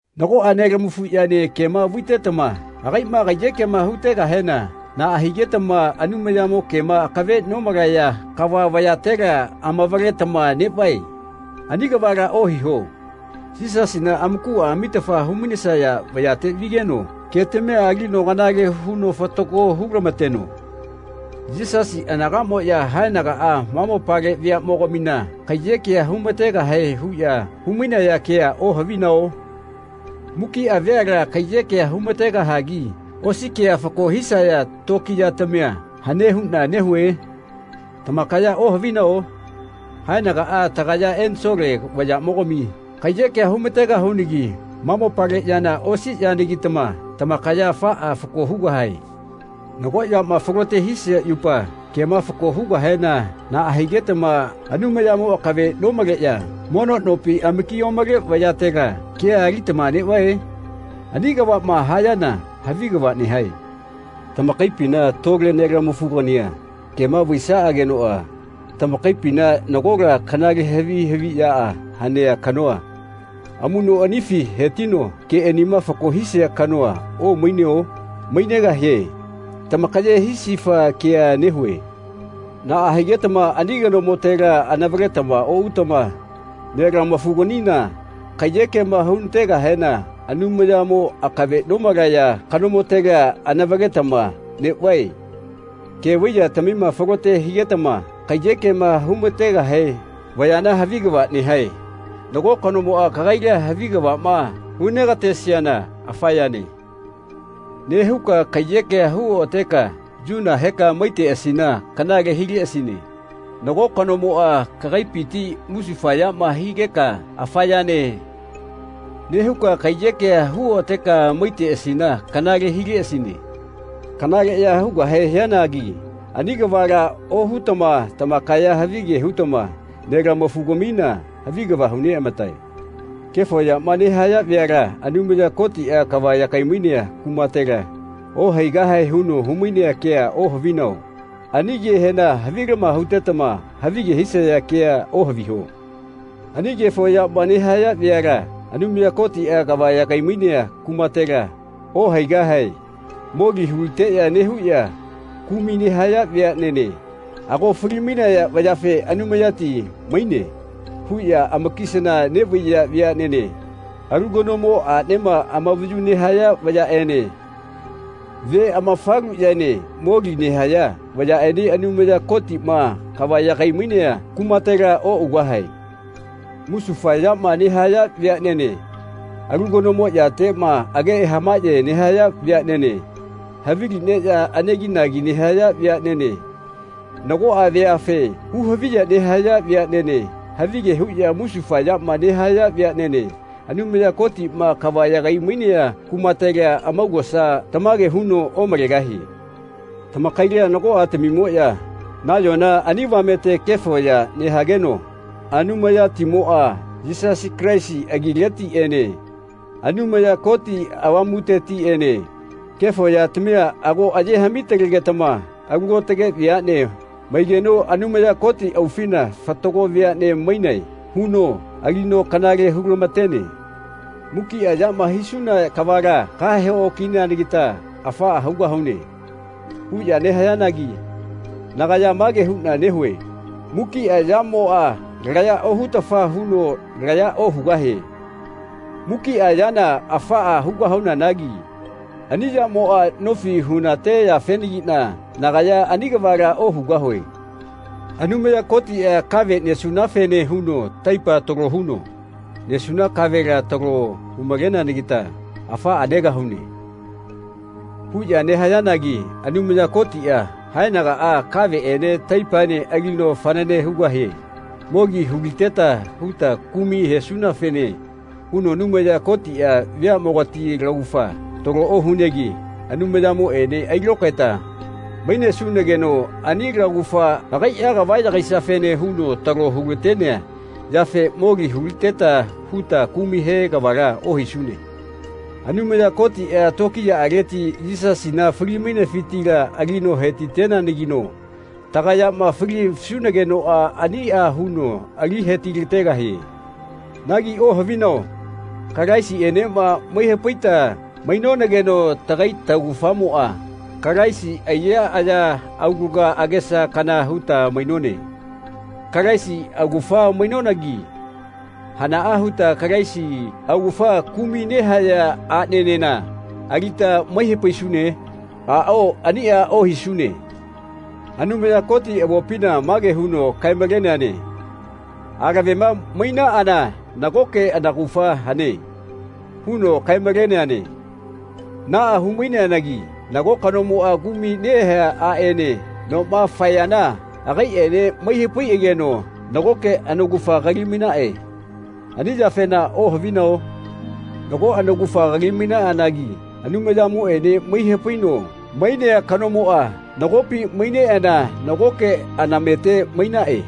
Nagoꞌa nelamafuꞌyaene kema vaitetama agaiꞌma kaiyekema hutegahena naꞌa higetama Anumayamo kema akave nomalaya kava vayatela amavaletama neꞌvae? Ani kavala ohiho. Yisasina amakuꞌa amitafa humainesaya vayate vigeno ketamia alino kanale huno fatago hulamateno. Yisasi anagaꞌmoꞌya haenagaꞌa ma mopale veaꞌmogamina kaiyekea humategahae huꞌya humainaya kea ohavinao? Mukiꞌa veala kaiyekea humategahagi osi kea fako hisaya tokiyatamia hane huꞌna nehue? Tamakaya ohavinao? Haenagaꞌa tagaya ensole vayaꞌmogami kaiyekea humategahunagi ma mopale yana osi yanagitama tamakaya afaꞌa fako hugahae. Nago yama falote hisia yupa kema fako hugahena naꞌa higetama Anumayamo akave nomaleꞌya mono nopi amaki omale vayatela kea alitama neꞌvae? Ani kavaꞌma hayana havi kava nehae. Tamakaipina tole nelamafugania kema vaisaꞌagenoꞌa tamakaipina nagola kanale havi haviꞌyaꞌa hanea kanoa amuꞌnoꞌanifi hetino keꞌanima fako hisia kanoa omaineo? Mainegahie. Tamakaye hisifa kea nehue. Naꞌa higetama ani kanomotela anavaletama oꞌutama nelamafuganina kaiyekema hunategahena Anumayamo akave nomalaya kanomotela anavaletama neꞌvae? Ke vai yatamima falote higetama kaiyekema humategahe vayana havi kava nehae. Nago kanomoꞌa kagaila havi kavaꞌma hunegatesiana “Afa yane.” nehuka kaiyekea hu oꞌateka yuna heka maiteꞌasina kanale hileꞌasine. Nago kanomoꞌa kagaipiti musufayama higeka “Afa yane.” nehuka kaiyekea hu oꞌateka maiteꞌasina kanale hileꞌasine. Kanaleꞌya hugahe hianagi ani kavala ohutama tamakaya havige hutama nelamafugamina havi kava huneꞌamatae. Kefo yama nehaya veala Anumaya Kotiꞌa kava yagai-mainea kumatela ohaigahae huno humainea kea ohavinao? Ani kehena havilama hutetama havige hisaya kea ohaviho. Ani kefo yama nehaya veala Anumaya Kotiꞌa kava yagai-mainea kumatela ohaigahae moli huliteꞌya nehuꞌya kumai nehaya veaꞌnene ago fali-mainaya vayafe “Anumayati maine.” huꞌya amakisana neꞌvaiya veaꞌnene alu kanomo aꞌnema amavayu nehaya vayaꞌene ve amafaluꞌyaene moli nehaya vayaꞌene Anumaya Kotiꞌma kava yagai-mainea kumatela oꞌugahae. Musufa yama nehaya veaꞌnene alu kanomo yateꞌma age hamaꞌye nehaya veaꞌnene havili neꞌya aneginagi nehaya veaꞌnene nagoꞌa veafe hu-haviya nehaya veaꞌnene havige huꞌya musufa yama nehaya veaꞌnene Anumaya Kotiꞌma kava yagai-mainea kumatela amaugosa tamage huno omalegahie. Tamakaila nagoꞌatamimoꞌya nayona ani avamete kefo ya nehageno Anumayatimoꞌa Yisasi Kalaisi agiletiꞌene Anumaya Koti Avamutetiꞌene kefo yatamia ago aye haꞌmi-talegetama alu aotage veaꞌne maigeno Anumaya Koti aufina “Fatago veaꞌne mainae.” huno alino kanale hulamatene. “Mukiꞌa yama hisuna kavala kahe-okineanagita afaꞌa hugahune.” huꞌya nehayanagi nagaya mage huꞌna nehue “Mukiꞌa yamoꞌa laya ohutafa huno laya ohugahie. Mukiꞌa yana afaꞌa hugahuanagi ani yamoꞌa nofi hunate yafenagiꞌna nagaya ani kavala ohugahue.” “Anumaya Kotiꞌa kave nesunafene huno taipa talo huno nesuna kavela talo humaleneanagita afaꞌa negahune.” huꞌya nehayanagi Anumaya Kotiꞌa haenagaꞌa kaveꞌene taipaene alino fanane hugahie. Moli huliteta huta kumai hesunafene huno Anumaya Kotiꞌa veaꞌmogati laugafa talo ohunegi Anumayamoꞌene ailokaeta mainesunageno ani laugafa agaiꞌa kava yagaisiafene huno talo hulatenea yafe moli huliteta huta kumai he kavala ohisune. Anumaya Kotiꞌa tokiyaꞌaleti Yisasina fali-mainefitila alino hetiteneanagino tagayama falisunagenoꞌa aniꞌa huno alino hetilategahie. Nagi ohavinao Kalaisiꞌenema mai hapaita mainonageno tagai taugafamoꞌa Kalaisi aiya, aya, aulaga, agesa, kana huta mainone. Kalaisi augafa mainonagi hanaꞌa huta Kalaisi augafa kumai nehaya aꞌnenena alita mai hapaisune? Aꞌao aniꞌa ohisune. Anumaya Koti avopina mage huno kae-maleneane “Alavema mainaꞌana nagoke anaugafa hane.” huno kae-maleneane. Naꞌa humaineanagi nago kanomoꞌa kumai nehea aꞌene noma faeyana agaiꞌene mai hapaiꞌageno nagoke anaugafa kali-mainaꞌe. Ani yafena ohavinao? Nago anaugafa kali mainaꞌanagi Anumayamoꞌene mai hapaino mainea kanomoꞌa nagopi maineꞌana nagoke anamete mainaꞌe.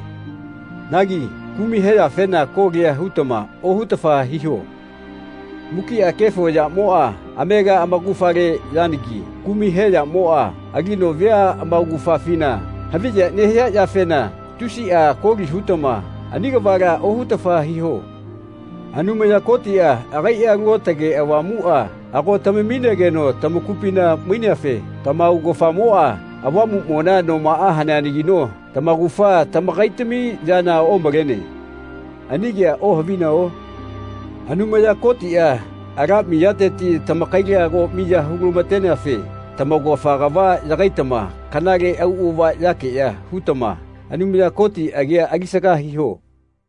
Nagi kumai heyafena kolia hutama ohutafa hiho. Mukiꞌa kefo yamoꞌa amega amaugafale yanagi kumai he yamoꞌa alino vea amaugafafina haviya nehia yafena tusiꞌa koli hutama ani kavala ohutafa hiho. Anumaya Kotiꞌa agaiꞌa Alu Aotage Avamuꞌa ago tamamigeno tamakupina maineafe tamaugafamoꞌa Avamuꞌmona nomaꞌa haneanagino tamaugafa tamakaitami yana omalene. Ani kea ohavinao? Anumaya Kotiꞌa ala miyateti tamakaila ago miya hulamateneafe tamaugafa kava yagaitama kanale auꞌava yakeꞌya hutama Anumaya Koti agia alisaga hiho.